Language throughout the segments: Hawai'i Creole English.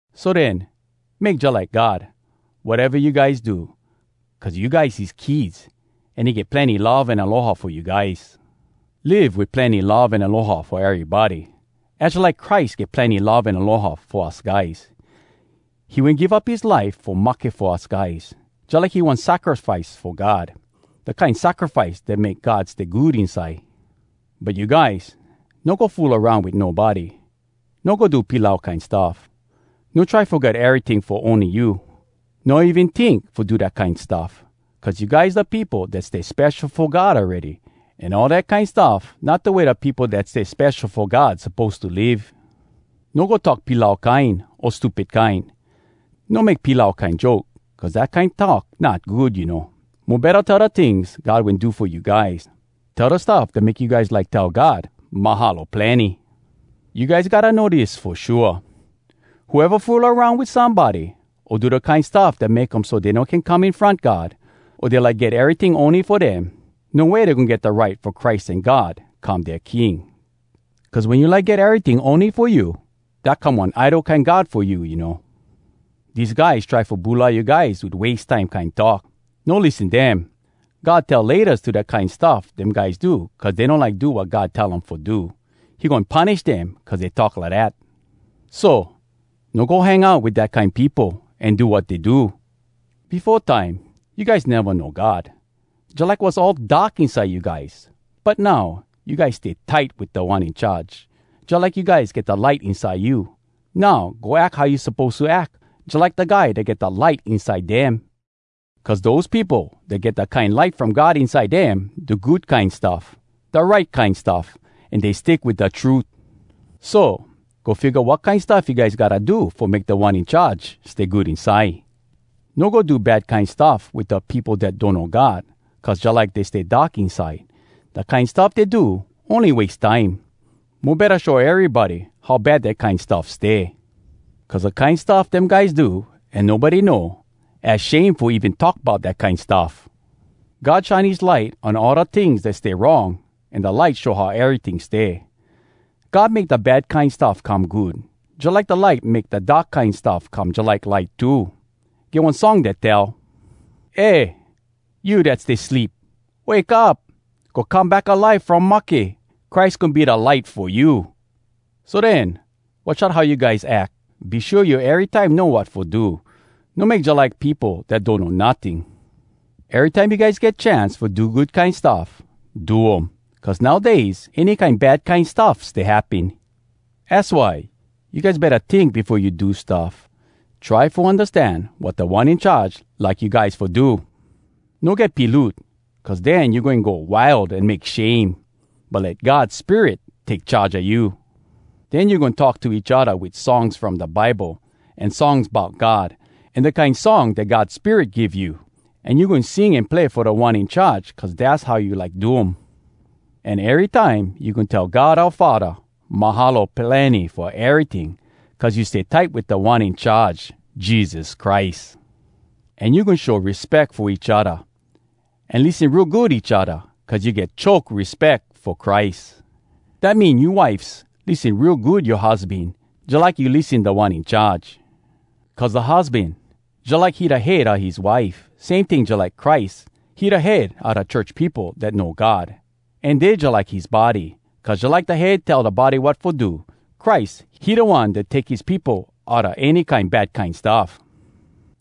So den, make jalike God, wateva you guys do. Cuz you guys his kids, an he get plenny love an aloha fo you guys. Live wit plenny love an aloha fo erybody. Az jalike Christ get plenny love an aloha fo us guys. He wen give up his life fo mahke fo us guys, jalike he one sacrifice fo God, da kine sacrifice dat make God stay good inside. But you guys, no go fool aroun wit nobody, no go do pilau kine stuff, no try fo get eryting fo ony you. No even tink fo do dat kine stuff. Cuz you guys da peopo dat stay spesho fo God awready, an all dat kine stuff not da way da peopo dat stay spesho fo God suppose to live. No go talk pilau kine o stupid kine. No make pilau kine joke cuz dat kine talk not good, you know. Mo betta tell da tings God wen do fo you guys. Tell da stuff dat make you guys like tell God “Mahalo plenny!” You guys gotta know dis fo shua: Whoeva fool aroun wit somebody, o do da kine stuff dat make um so dey no can come in front God, o dey like get eryting ony fo dem, no way dey goin get da right fo Christ an God come dea king. Cuz wen you like get eryting ony fo you, dat come one idol kine god fo you, you know. Dese guys try fo bulai you guys wit wase time kine talk! No lissen dem! God tell “Laytas” to da kine stuff dem guys do cuz dey no like do wat God tell um fo do. He goin punish dem cuz dey talk lidat. So, no go hang out wit dat kine peopo an do wat dey do. Befo time, you guys neva know God. Jalike was all dark inside you guys. But now, you guys stay tight wit Da One In Charge, jalike you guys get da light inside you. Now, go ack how you suppose to ack, jalike da guys dat get da light inside dem. Cuz dose peopo dat get dat kine light from God inside dem do good kine stuff, da right kine stuff, an dey stick wit da trut. So, go figga wat kine stuff you guys gotta do fo make Da One In Charge stay good inside. No go do bad kine stuff wit da peopo dat donno God cuz jalike dey stay dark inside. Da kine stuff dey do ony wase time. Mo betta show erybody how bad dat kine stuff stay. Cuz da kine stuff dem guys do an nobody know, az shame fo even talk bout dat kine stuff. God shine his light on all da tings dat stay wrong an da light show how eryting stay. God make da bad kine stuff come good, jalike da light make da dark kine stuff come jalike light too. Get one song dat tell: “Eh, you dat stay sleep, wake up! Go come back alive from mahke! Christ goin be da light fo you.” So den, watch out how you guys ack. Be shua you erytime know wat fo do. No make jalike peopo dat donno notting. Erytime you guys get chance fo do good kine stuff, do um. Cuz nowdays, any kine bad kine stuff stay happen. Az why, you guys betta tink befo you do stuff. Try fo undastan wat Da One In Charge like you guys fo do. No get piloot cuz den you goin go wild an make shame. But let God Spirit take charge a you. Den you goin talk to each odda wit songs from da Bible, an songs bout God, an da kine song dat God Spirit give you. An you goin sing an play fo Da One In Charge cuz dass how you like do um. An erytime you goin tell God oua Faddah “Mahalo plenny” fo eryting cuz you stay tight wit Da One In Charge, Jesus Christ. An you goin show respeck fo each odda an lissen real good each odda cuz you get choke respeck fo Christ. Dat mean, you wifes, lissen real good yoa husban, jalike you lissen Da One In Charge. Cuz da husban, jalike he da head a his wife. Same ting jalike Christ, he da head a da church peopo dat know God, an dey jalike his body. Cuz jalike da head tell da body wat fo do, Christ, he da One dat take his peopo outa any kine bad kine stuff.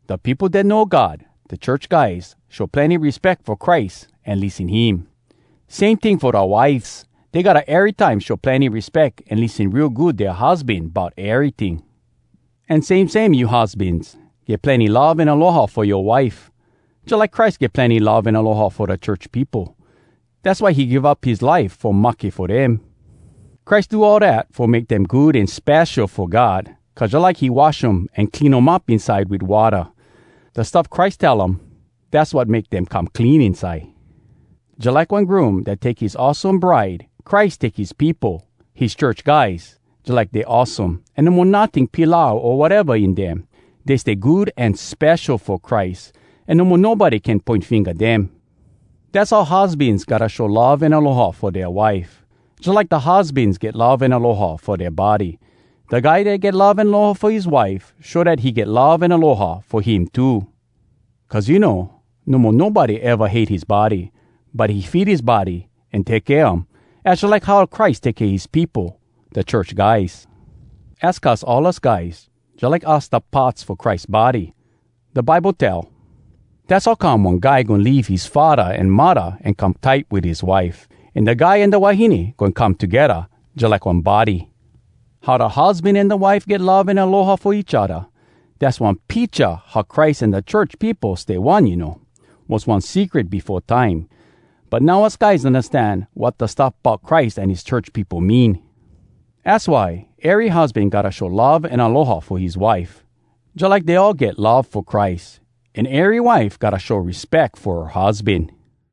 Da peopo dat know God, da church guys, show plenny respeck fo Christ an lissen him. Same ting fo da wifes. Dey gotta erytime show plenny respeck an lissen real good dea husban bout eryting. An same same you husbans, get plenny love an aloha fo yoa wife, jalike Christ get plenny love an aloha fo da church peopo. Dass why he give up his life fo mahke fo dem. Christ do all dat fo make dem good an spesho fo God cuz jalike he wash um an clean um up inside wit watta. Da stuff Christ tell um, dass wat make dem come clean inside. Jalike one groom dat take his awesome bride, Christ take his peopo, his church guys, jalike dey awesome, an no mo notting pilau o wateva in dem. Dey stay good an spesho fo Christ an no mo nobody can poin finga dem. Dass how husbans gotta show love an aloha fo dea wife, jalike da husbans get love an aloha fo dea body. Da guy dat get love an aloha fo his wife show dat he get love an aloha fo him too. Cuz you know, no mo nobody eva hate his body, but he feed his body an take kea um. Az jalike how Christ take kea his peopo, da church guys. Az cuz all us guys, jalike us da parts fo Christ body. Da Bible tell, “Dass how come one guy goin leave his faddah an muddah an come tight wit his wife. An da guy an da wahine goin come togedda jalike one body.” How da husban an da wife get love an aloha fo each odda, dass one picha how Christ an da church peopo stay one you know. Was one secret befo time, but now us guys undastan wat da stuff bout Christ an his church peopo mean. Az why, ery husban gotta show love an aloha fo his wife, jalike dey all get love fo Christ, an ery wife gotta show respeck fo her husban.